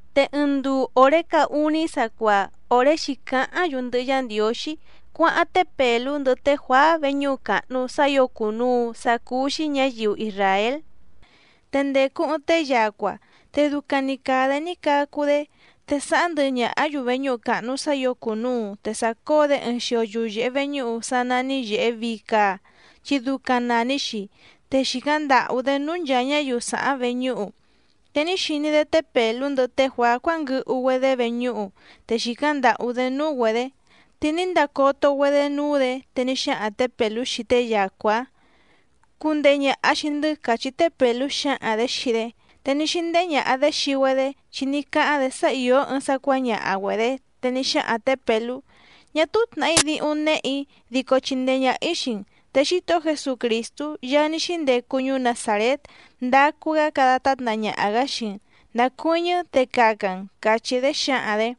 Te ɨɨⁿ nduu òré caá úní sacuaa, òré xǐcáháⁿ‑yu ndɨhɨ Yá Ndiǒxí cuáháⁿ té Pèlú ndɨhɨ té Juàá veñúhu càhnu sá ǐo cùnuu sácúú‑xí ñǎyiu isràél. Te ndècu ɨɨⁿ tée yacua, te ducaⁿ‑ni càa‑dé ní cacu‑dé. Te sàháⁿ ndɨhɨ ñàhá‑yu veñúhu càhnu sá ǐo cùnuu, te sàcóo‑dé ɨɨⁿ xio yuyèhe veñúhu sá nání Yèhe Vii Caa, chi ducaⁿ nàni‑xi, te xìcáⁿ ndàhú‑dé núú nchàa ñáyiu sàháⁿ veñúhu. Te ní xiní‑dé té Pèlú ndɨhɨ té Juàá cuánguɨhu‑güedé veñúhu, te xìcáⁿ ndàhú‑dé núú‑güedě. Te ní ndacoto‑güedé núú‑dě, te ní xáhaⁿ tě Pèlú xii tée yacua‑ǎⁿ: —Cundehe ñàha xii‑ndɨ́ —càchí té Pèlú xǎhaⁿ‑dě xii‑dé. Te ní xíndéhé ñàha‑dé xii‑güedé, chi ní cáháⁿ‑dě sá ìó ɨɨⁿ sá cuǎñaha‑güedě. Te ní xáhaⁿ tě Pèlú: —Ñá túú tnàhí díhúⁿ néhè‑í dico chindee ñàha‑í xii‑n, te Xítohó Jesucrìstú Yaá ní xíndecu ñuú Nazàrét, ndacu‑gá cada tátna ñaha‑gǎ xii‑n, ndacuɨ́ñɨ́ te caca‑n —càchí‑dé xǎhaⁿ‑dě.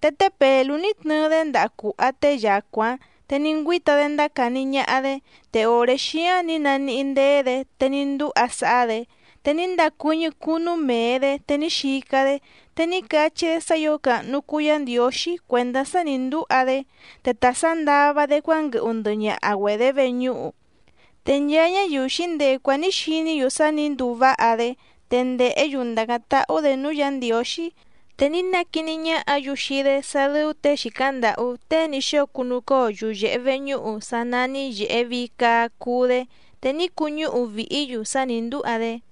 Te té Pèlú ní tnɨɨ‑dé ndaha cùha tée yacua‑ǎⁿ, te ní ngüíta‑dé ndácàni ñaha‑dé, te òré xíáⁿ nǐ naníhí ndéé‑dě, te ní ndúha sáhá‑dě. Te ní ndacuɨ́ñɨ́ cunu mee‑dě te ní xica‑dé, te ní cachí‑dé sá ǐo càhnu cuu Yá Ndiǒxí cuèndá sá nǐ ndúha‑dé, te ta sǎndava‑dé cuánguɨhu ndɨhɨ ñaha‑güedě veñúhu. Te nchaa ñáyiu xǐndecu‑áⁿ nǐ xiní‑yu sá nǐ nduu váha‑dé, te ndèhé‑yu ndàcáⁿ táhú‑dě núú Yǎ Ndiǒxí. Te ní naquiní ñáhǎ‑yu xii‑dé sá dɨ́ú těe xìcáⁿ ndàhú tée ní xóo cunucóo yuyèhe veñúhu sá nání Yèhe Vii Caa cuu‑dé, te ní cuñúhu vìhí‑yu sá nǐ ndúha‑dé.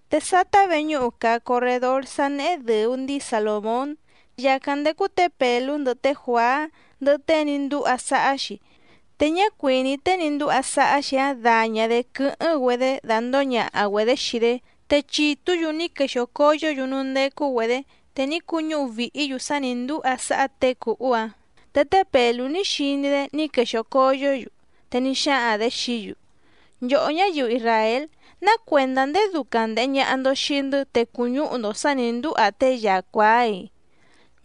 Te sátá véñǔhu càa corredór sá néhé dɨ̀u ndíi Salòmón. Yàcáⁿ ndécú tě Pèlú ndɨhɨ té Juàá ndɨhɨ tée ní ndúha sáhá‑xi, te ñá cuìní tée ní ndúha sáhá‑xi‑áⁿ daña‑dě quɨ́hɨ́ⁿ‑güedé dandǒo ñaha‑güedě xii‑dé. Te chìtú‑yu ní quexìo coyó‑yu núú ndécú‑güedě, te ní cuñúhu vìhí‑yu sá nǐ ndúha sáhá těe cùhú‑áⁿ. Te té Pèlú ní xiní‑dé ní quexìo coyó‑yu, te ní xáhaⁿ‑dě xií‑yu: —Nchòhó ñáyiu isràél, ¿ná cuèndá ndéé dúcáⁿ ndèhe ñaha‑ndo xii‑ndɨ́ te cùñúhu‑ndo sǎ nǐ ndúha tée yacua‑áiⁿ?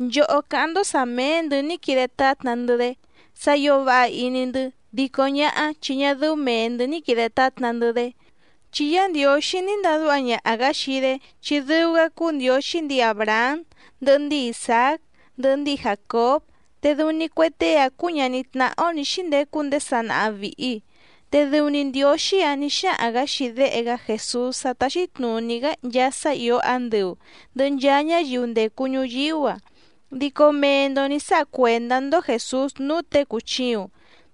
Nchòhó cáháⁿ‑ndó sǎ méé‑ndɨ̌ ní quide tátna‑ndɨ́‑dé sá ǐo váha iní‑ndɨ́, dico ñáhá chi ñá dɨ́ú mèe‑ndɨ́ ní quìde tátna‑ndɨ́‑dé. Chi Yá Ndiǒxí ní ndadúha ñaha‑gǎ xii‑dé, chi dɨu‑gá cúú Ndiǒxí ndǐi Àbrahám ndɨhɨ ndíi Isàác ndɨhɨ ndíi Jàcób, te dɨu‑ni cue tée‑áⁿ cúú ñàní tnáhá‑ó nǐ xíndecu ndéé sanaha vìhi. Te dɨu‑ni Ndiǒxí‑áⁿ nǐ xáhaⁿ‑gǎ xii Déhe‑gá Jèsús sá táxí tnùní‑gá nchaa sá ìó andɨu ndɨ̀hɨ nchaa ñáyiu ndècu ñuyíú‑a, dico mee‑ndo nǐ sáha cuèndá‑ndó Jèsús núú těe cùchiuⁿ.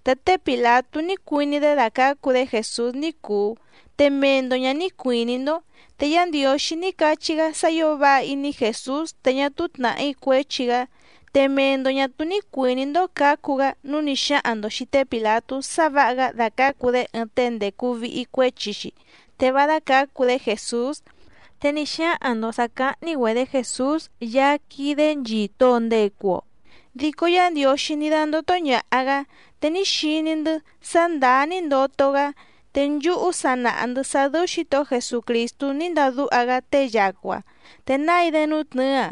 Te té Pìlatú ní cuiní‑dé dacǎcu‑dé Jèsús ní cùu, te mee‑ndo ñǎ ní cuìní‑ndó. Te Yá Ndiǒxí ní cachí‑gá sá ǐo váha iní Jèsús te ñá túú tnàhí cuéchi‑gá. Te mee‑ndo ñà túú ní cuìní‑ndó cǎcu‑gá nǔu ní xáhaⁿ‑ndo xìi té Pìlatú sá vǎha‑gá dacǎcu‑dé ɨɨⁿ tée ndècu vihi cuéchi‑xi, te vá dácǎcu‑dé Jèsús. Te ní xáhaⁿ‑ndo sǎ cáhní‑güedě Jèsús Yaá quídé nchìto‑o ndecu‑o, dico Yá Ndiǒxí ní dándótó ñàha‑gá, te ní xiní‑ndɨ́ sá ndàá ní ndoto‑gá. Te nchúhú sa nàha‑ndɨ́ sá dɨ́ú Xǐtohó Jesucrìstú ní ndadúha‑gá tée yacua, te nái‑dé nútnɨ̌ɨ‑a.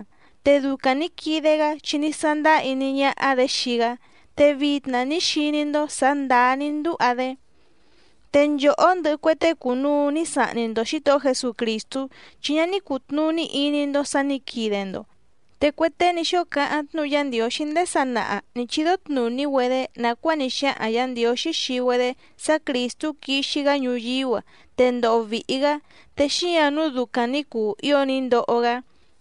Te ducaⁿ nǐ quide‑gá chi ní sándáá iní ñáhá‑dě xii‑gá, te vitna ní xiní‑ndó sǎ ndàá ní ndúha‑dé. ’Te nchòhó ndɨhɨ cue tée cùnuu ní sahni‑ndo Xǐtohó Jesucrìstú, chi ñá ní cùtnuní iní‑ndó sǎ nǐ quide‑ndo. Te cue tée ní xóo cáháⁿ tnúhu Yá Ndiǒxí ndéé sanaha nǐ chídó tnùní‑güedé nàcuáa ní xáhaⁿ Yǎ Ndiǒxí xii‑güedé sá Crìstú quixi‑gá ñuyíú‑a, te ndoho vìhi‑gá, te xíǎⁿ nǔu ducaⁿ nǐ cuu ío ní ndoho‑gá.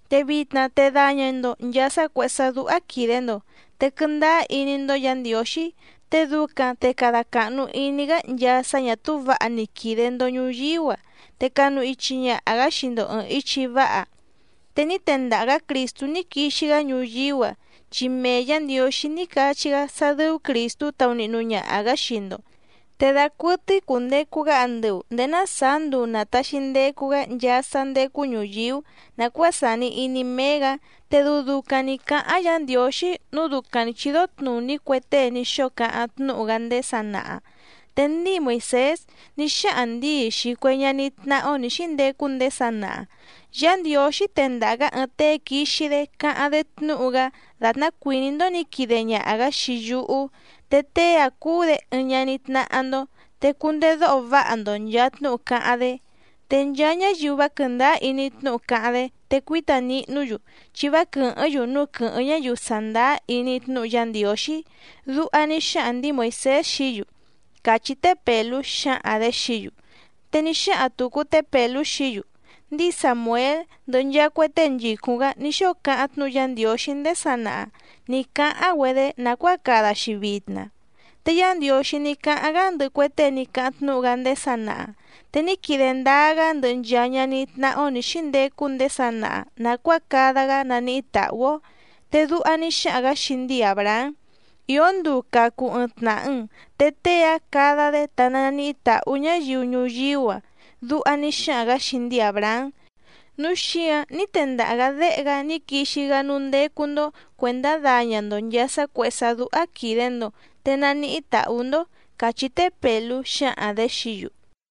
Te vitna te daña‑ndo nchàa sá cuèhé sá dúhá quìde‑ndo. Te quɨndáá iní‑ndó Yǎ Ndiǒxí, te ducaⁿ te cada càhnu iní‑gá nchaa sá ñà túú vǎha ní quide‑ndo ñùyíú‑a, te canu ichi ñaha‑gǎ xii‑ndo ɨ̀ɨⁿ ichi váha. Te ní tendaha‑gǎ Crìstú ní quixi‑gá ñuyíú‑a, chi mee Yǎ Ndiǒxí ní cachí‑gá sá dɨ́ú Crìstú taunihnu ñaha‑gǎ xii‑ndo. Te dacuɨtɨ́í cùndecu‑gá andɨu nděé ná sàá nduu nàtaxi ndecu‑gá nchaa sá ndécú ñùyíú nàcuáa sàni iní méé‑gǎ. Te dɨu ducaⁿ nǐ cáháⁿ Yǎ Ndiǒxí nǔu ducaⁿ nǐ chídó tnùní cue tée ní xóo cáháⁿ tnúhu‑gá ndéé sanaha. Te ndíi Moìsés ní xáhaⁿ ndǐi xii cue ñaní tnáhá‑ó nǐ xíndecu ndéé sanaha: “Yá Ndiǒxí tendaha‑gǎ ɨɨⁿ tée quixi‑dé cáháⁿ‑dé tnúhu‑gá dàtná cuìní‑ndó nǐ quide ñaha‑gǎ xii yúhú, te tée‑áⁿ cuu‑dé ɨɨⁿ ñaní tnáhá‑ndó. Te cundedóho váha‑ndo nchàa tnúhu cáháⁿ‑dé. Te nchaa ñáyiu vá quɨ̀ndáá iní tnúhu cáháⁿ‑dé, te cuíta nihnú‑yu chi vá quɨ̀hɨ́ⁿ‑yu núú quɨ̌hɨ́ⁿ ñáyiu sàndáá iní tnúhu Yá Ndiǒxí”, duha ní xáhaⁿ ndǐi Moìsés xií‑yu —càchí té Pèlú xǎhaⁿ‑dě xií‑yu. Te ní xáhaⁿ tùcu té Pèlú xií‑yu: —Ndíi Sàmuél ndɨhɨ nchaa cue tée nchìcúⁿ‑gá ní xóo cáháⁿ tnúhu Yá Ndiǒxí ndéé sanaha nǐ cáháⁿ‑güedé nàcuáa cada‑xi vitna. Te Yá Ndiǒxí ní cáháⁿ‑gá ndɨhɨ cue tée ní cáháⁿ tnúhu‑gá ndéé sanaha. Te ní quide ndáá‑gá ndɨhɨ nchaa ñaní tnáhá‑ó nǐ xíndecu ndéé sanaha nàcuáa cada‑gá naníhí tàhú‑ó. Te duha ní xáhaⁿ‑gǎ xii ndíi Àbrahám: “Ìó nduu cacu ɨɨⁿ tnàha‑n, te tée‑áⁿ cada‑dé te naníhí tàhú ñáyiu ñuyíú‑a”, duha ní xáhaⁿ‑gǎ xii ndíi Àbrahám. Núu xíǎⁿ ní tendaha‑gǎ Déhe‑gá ní quixi‑gá núú ndécú‑ndó cuèndá daña‑ndo nchàa sá cuèhé sá dúhá quìde‑ndo, te naníhí tàhú‑ndó —càchí té Pèlú xǎhaⁿ‑dě xií‑yu.